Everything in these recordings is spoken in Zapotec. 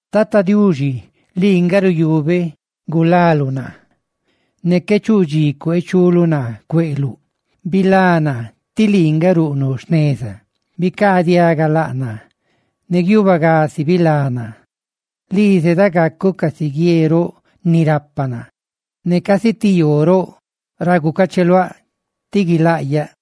Tata Diuxi, lii nga ruyuubeꞌ gulaluꞌ naa; ¡ne qué chuꞌ dxi cuee chuluꞌ naa cueꞌluꞌ! ¡Bilá naa, tí lii nga ruꞌnuꞌ jneza! Bicaadiaga laꞌ naa; ¡ne guiubagasi bilá naa! Lii zeda gacuꞌ casi guie roꞌ ni rapa naa, ¡ne casi ti yoo roꞌ ra gucacheluáꞌ ti guilaꞌyaꞌ!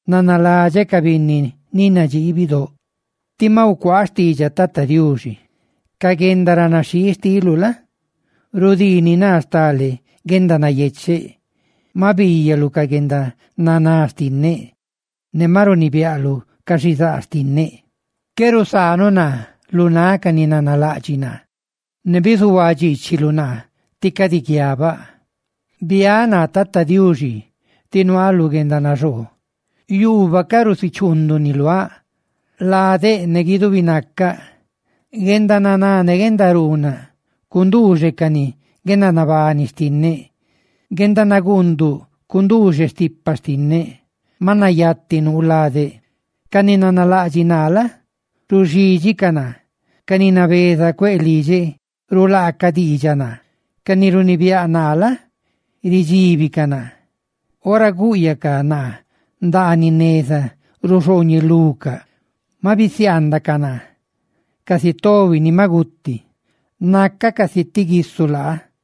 Nanaladxeꞌ ca binni ni nadxii bidóꞌ. Tí maꞌ gucuaaꞌ xtiidxaꞌ Tata Diuxi. Ca guendaranaxhii xtiluꞌ la? rudiini naa stale guendanayecheꞌ. Maꞌ biiyaluꞌ ca guendananá xtinneꞌ, ne maꞌ runibiaꞌluꞌ ca xizaa xtinneꞌ; qué nusaanuꞌ naa lu náꞌ ca ni nanalaꞌdxiꞌ naa; ¡ne bizuhuaa dxiichiluꞌ naa tí cadi guiabaꞌ! Biáꞌ naa Tata Diuxi, tí nuaaꞌ lu guendanaxoo. Yuubaꞌ ca rusichuunduni luaꞌ, ladeꞌ ne guidubi naca. ¡Guendananá ne guendaruunaꞌ cunduuxecani guendanabani xtinneꞌ! Guendanaguunduꞌ cunduuxe stipa xtinneꞌ; ¡maꞌ nayati nuu ladeꞌ! Ca ni nanalaꞌdxiꞌ naa la? ruxídxicaꞌ naa, ca ni nabeza cueꞌ lidxeꞌ rulaacaꞌ diidxaꞌ naa, ca ni runibiáꞌ naa la? ridxíbicaꞌ naa. ¡Ora guꞌyaꞌcaꞌ naa ndaaniꞌ neza, ruxooñelucaꞌ! Ma bisiaandacaꞌ naa, casi tobi ni maꞌ guti. Nacaꞌ casi ti guisu laa.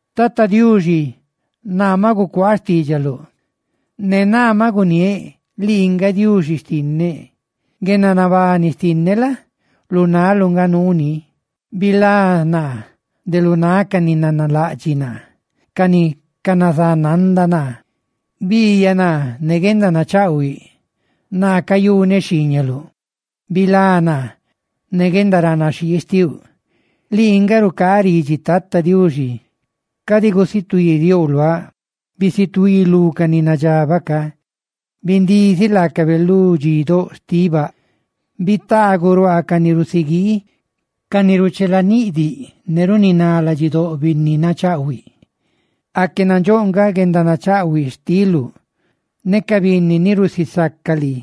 Tata Diuxi, naa maꞌ gucuaaꞌ xtiidxaluꞌ; ne naa maꞌ guniéꞌ: «¡Lii nga Diuxi xtinneꞌ!» Guendanabani xtinneꞌ la? lu naluꞌ nga nuuni; ¡bilá naa de lu náꞌ ca ni nanalaꞌdxiꞌ naa, ca ni canazananda naa! Biiyaꞌ naa ne guendanachaꞌhuiꞌ, naa cayuneꞌ xhiiñaluꞌ, bilá naa ne guendaranaxhii xtiuꞌ. Lii nga rucaaꞌ ridxi Tata Diuxi; ¡cadi gusutuidiouꞌ luaꞌ! ¡Bisutuí lu ca ni nadxabaꞌ ca; bindiziꞌ laacabe lu dxidóꞌ xtiꞌ baꞌ! Bitaaguꞌ ruaa ca ni rusiguii; ca ni ruchelaniꞌdiꞌ, ne runiná ladxidóꞌ binni nachaꞌhuiꞌ. ¡Aque nandxóꞌ nga guendanachaꞌhuiꞌ xtiluꞌ ne ca binni ni rusisaca lii!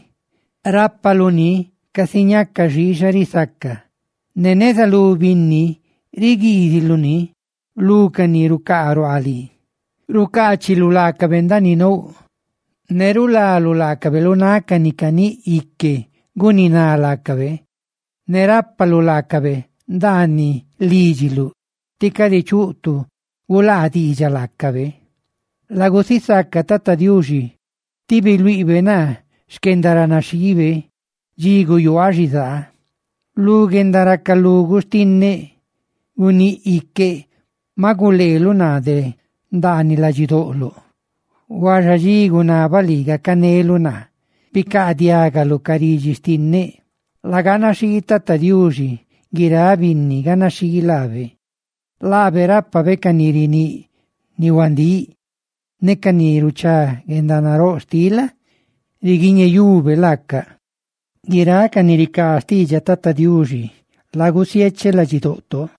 Rápaluꞌ ni casi ñácani xiixa risaca ne neza lú binni, riguiiziluꞌ ni lu ca ni rucaa ruaaꞌ lii. Rucaachiluꞌ laacabe ndaaniꞌ nouꞌ, ne rulaluꞌ laacabe lu náꞌ ca ni caníꞌ ique guniná laacabe; ne rápaluꞌ laacabe ndaaniꞌ lídxiluꞌ tí cadi chuꞌ tu gulaa diidxaꞌ laacabe. Lagusisaca Tata Diuxi, tí biluiꞌbe naa xquendaranaxhiibe dxi guyuaaꞌ xizaa. Lu guendaracaluguꞌ xtinneꞌguníꞌ iqueꞌ, maꞌ guleeluꞌ naa de ndaaniꞌ ladxidoꞌloꞌ; huaxa dxi gunabaꞌ lii gacaneluꞌ naa, bicaadiagaluꞌ ca ridxi xtinneꞌ. Laganaxhii Tata Diuxi, guiráꞌ binni ganaxhii laabe. Laabe rápabe ca ni riníꞌ ni huandíꞌ, ne ca ni ruchá guendanaróꞌ xtiꞌ la? riguiñeyube laaca. Guiráꞌ ca ni ricaa xtiidxaꞌ Tata Diuxi, lagusiecheꞌ ladxidoꞌto.